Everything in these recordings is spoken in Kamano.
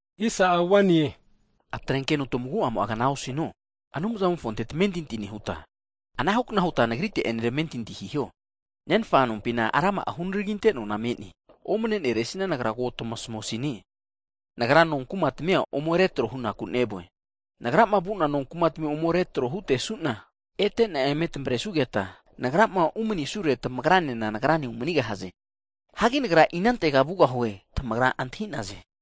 Hagi atrenkeno tamagu'amo'a kna osino, Anumzamofonte tamentinti nehuta, anahu kna huta Nagrite'ene tamentinti hiho. Nenfa nompina rama'a hunaraginte nona me'ne, omne'neresina Nagra ko tamasmusine, Nagra, nonkuma tamia ome retro hunaku nevue. Nagrama vu'na nonkumatmi ome retro hutesu'na, ete e'na eme tamavresugeta, Nagrama umanisure, tamagra Nagrane umanigahaze. Hagi Nagra inantega vugahuo, tamagra antahi'naze.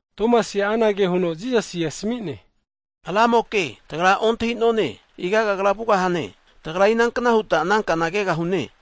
Tomasi'a anage huno Jisasina asmi'ne, Ramoke tagra ontahi'none, iga Kagra vugahane, tagra inankna huta ana kana keta antahita hugahune?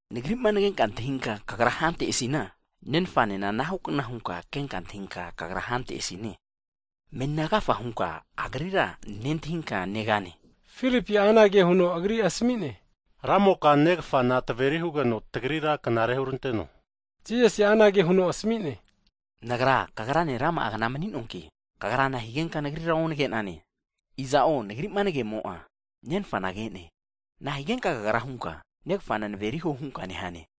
Nagri'ma nagenka nantahinka kagra hantesina, Nenfanena anahu kna hunka kenka antahinka kagra hantesine, meni agafa hunka Agrira nentahinka negane. Filipi'a anage huno Agrira asami'ne, Ramoke Negafana tveri hugeno tagrira knare huranteno. Jisasi'a anage huno asmi'ne, Nagra tamagranena rama'a kna mani'noanki, Filipiga kagra nahigenka Nagrira nagenka antahinka osu'nane? Iza'o Nagri'ma nagemo'a, Nenfana ke'ne! Nahigenka kagra hunka, Negafana naveri huo hunka nehane?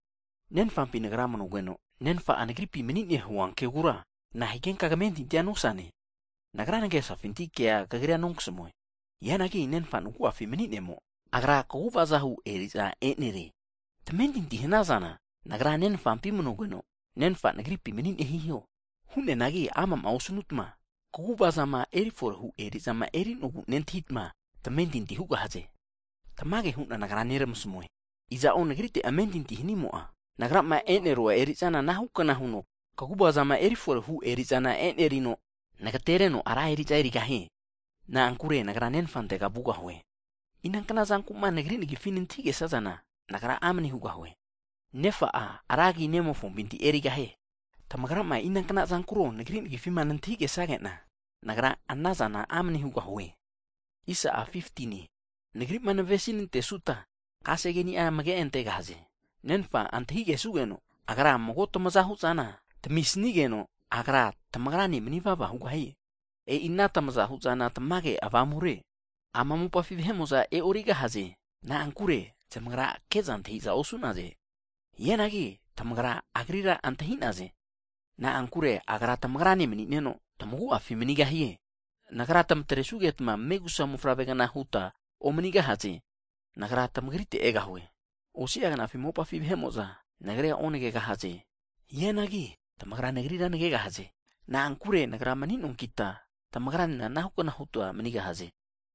Nenfampi Nagra manugeno, Nenfa'a Nagripi mani'ne hua kegura, nahigenka kamentintia nosane? Nagra nagesafinti kea kagrira nonkasamue. Hianagi Nenfa'a nagu'afi mani'nemo, Agra kaguvaza hu eri'za e'nerie. Tamentintima hanazana, Nagra Nenfampi manugeno, Nenfa'a Nagripi mani'ne hiho, hu'neanagi ana'ma osnutma kaguvazama eri forehu eri'zama eri'nogu nentahitma tamentinti hugahaze. Tamage hu'na Nagra neramasmue, iza'o Nagrite amentinti hanimo'a, Nagrama e'nerua eri'zana anahu kna huno kaguvazama eri forehu eri'za e'nerino, Nagatereno ra eri'za erigahie, na'ankure Nagra Nenfantega vugahue. Inankna zanku'ma Nagri nagifi nantahigesazana, Nagra amne hugahue. Ana hanugeno Nenfa'a ra agi Nemofompinti erigahie. Tamagrama inankna zankuro Nagri nagifima nantahi kesage'na, Nagra anazana amne hugahue. Jisasi'a mago'ane huno, Nagri'ma navesinantesuta keni'a amage antegahaze. Nenfana antahigesugeno, Agra mago tamaza hu'zana tamisnigeno, Agra tamagrane manivava hugahie. E'i ana tamaza hu'zana tamage Avamure, ama mopafi vahe'mo'za e'origahaze. Na'ankure zamagra ke'za antahi'za osu'naze. Hianagi tamagra Agrira (Avamura) keta antahita hu'naze. Na'ankure Agra tamagrane mani'neno, tamagu'afi manigahie. Nagra tamatresugetma megusa mofavregna huta omanigahaze. Nagra tamagritega egahue. Osi'a knafi mopafi vahe'mo'za Nagrira onagegahaze, hianagi tamagra Nagrira nagegahaze. Na'ankure Nagra mani'noankita, tamagranena anahu kna huta manigahaze.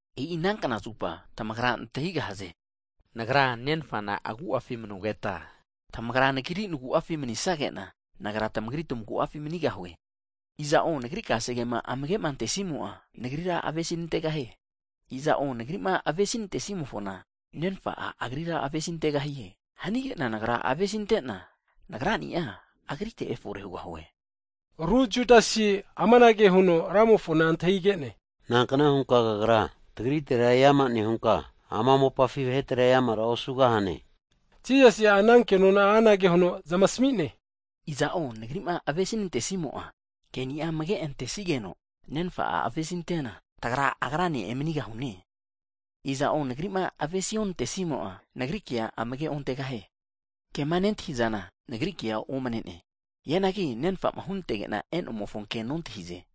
E'i ana knazupa, tamagra antahigahaze Nagra Nenfana agu'afi manugeta, tamagra Nagri nagu'afi manisagena, Nagra tamagri tamagu'afi manigahue. Iza'o Nagri kasegema amage antesimo'a, Nagrira avesinantegahie, iza'o Nagri'ma avesinantenimofona Nenfa'a agrira avesintegahie, hanige'na Nagra avesintena, Nagra'ni'a agrite efore hugahue. Higeno ru Judasi'a amanage huno Ramofona antahige'ne, Nankna hunka Kagra tagritera eama nehunka, ama mopafi vahetera eamara osugahane? Higeno Jisasi'a ana kenona'a anage huno zamasmi'ne, Iza'o Nagri'ma avesi nantesimo'a, ke'nia amage antesigeno, Nenfa'a avesintena tagra, agrane emanigahune. Iza'o Nagri'ma avesi onantesimo'a, Nagri kea amage ontegahie. Ama kema nentahizana Nagri kea omne'ne, hianagi Nenfa'ma hunantege'na e'nomofo ke nontahize.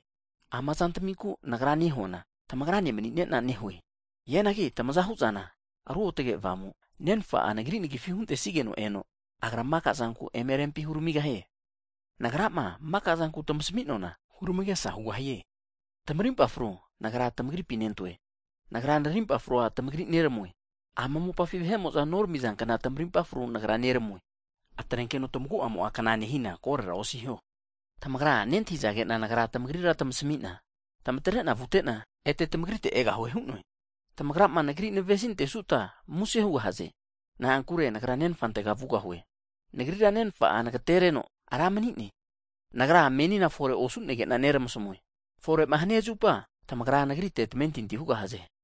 Ama zantaminku'ma Nagra nehuana, tamagrane mani'nena nehue. Hianagi tamaza hu'zana, Ruotge Avamu, Nenfa'a Nagri nagifi huntesigeno eno, Agra maka'zanku eme rempi huramigahie. Nagrama maka'zanku tmasmi'noana hurmagesa hugahie. Tamarimpa fruza Nagra tamagripi nentoe, Nagra narimpa frua tamagri neramue, ama mopafi vahe'mo'za neramizankna tamarimpa frua Nagra noramue. Atrenkeno tamagu'amo'a kna nosina korora osiho. Tamagra nentahizage'na Nagra tamagrira tamasmi'na, tmatre'na vute'na, ete tamagrite egahue hu'noe. Tamagrama Nagri'ma navesinantazaresina muse hazaresine. Na'ankure Nagra Nenfantega vugahue. Nagrira Nenfa'a nagtereno Ra mani'ne. Nagra menina fore osu'negena neramasmue, fore'ma hania zupa, tamagra Nagrite tamentinti hugahaze.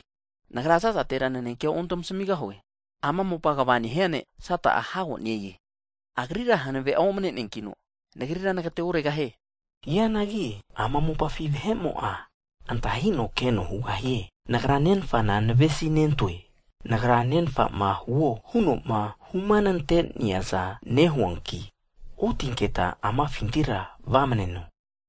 Nagra za'zatera nanekea ontamasmigahue, ama mopa kva nehia ne' Sata'a hago ne-e, agrira hanave'a omne'neankino, Nagrira nagateoregahie. Hianagi ama mopafi vahe'mo'a antahino keno hugahie, Nagra Nenfana navesinentoe, Nagra Nenfa'ma huo huno'ma humanante'neaza nehuanki, otinketa amafintira vamneno.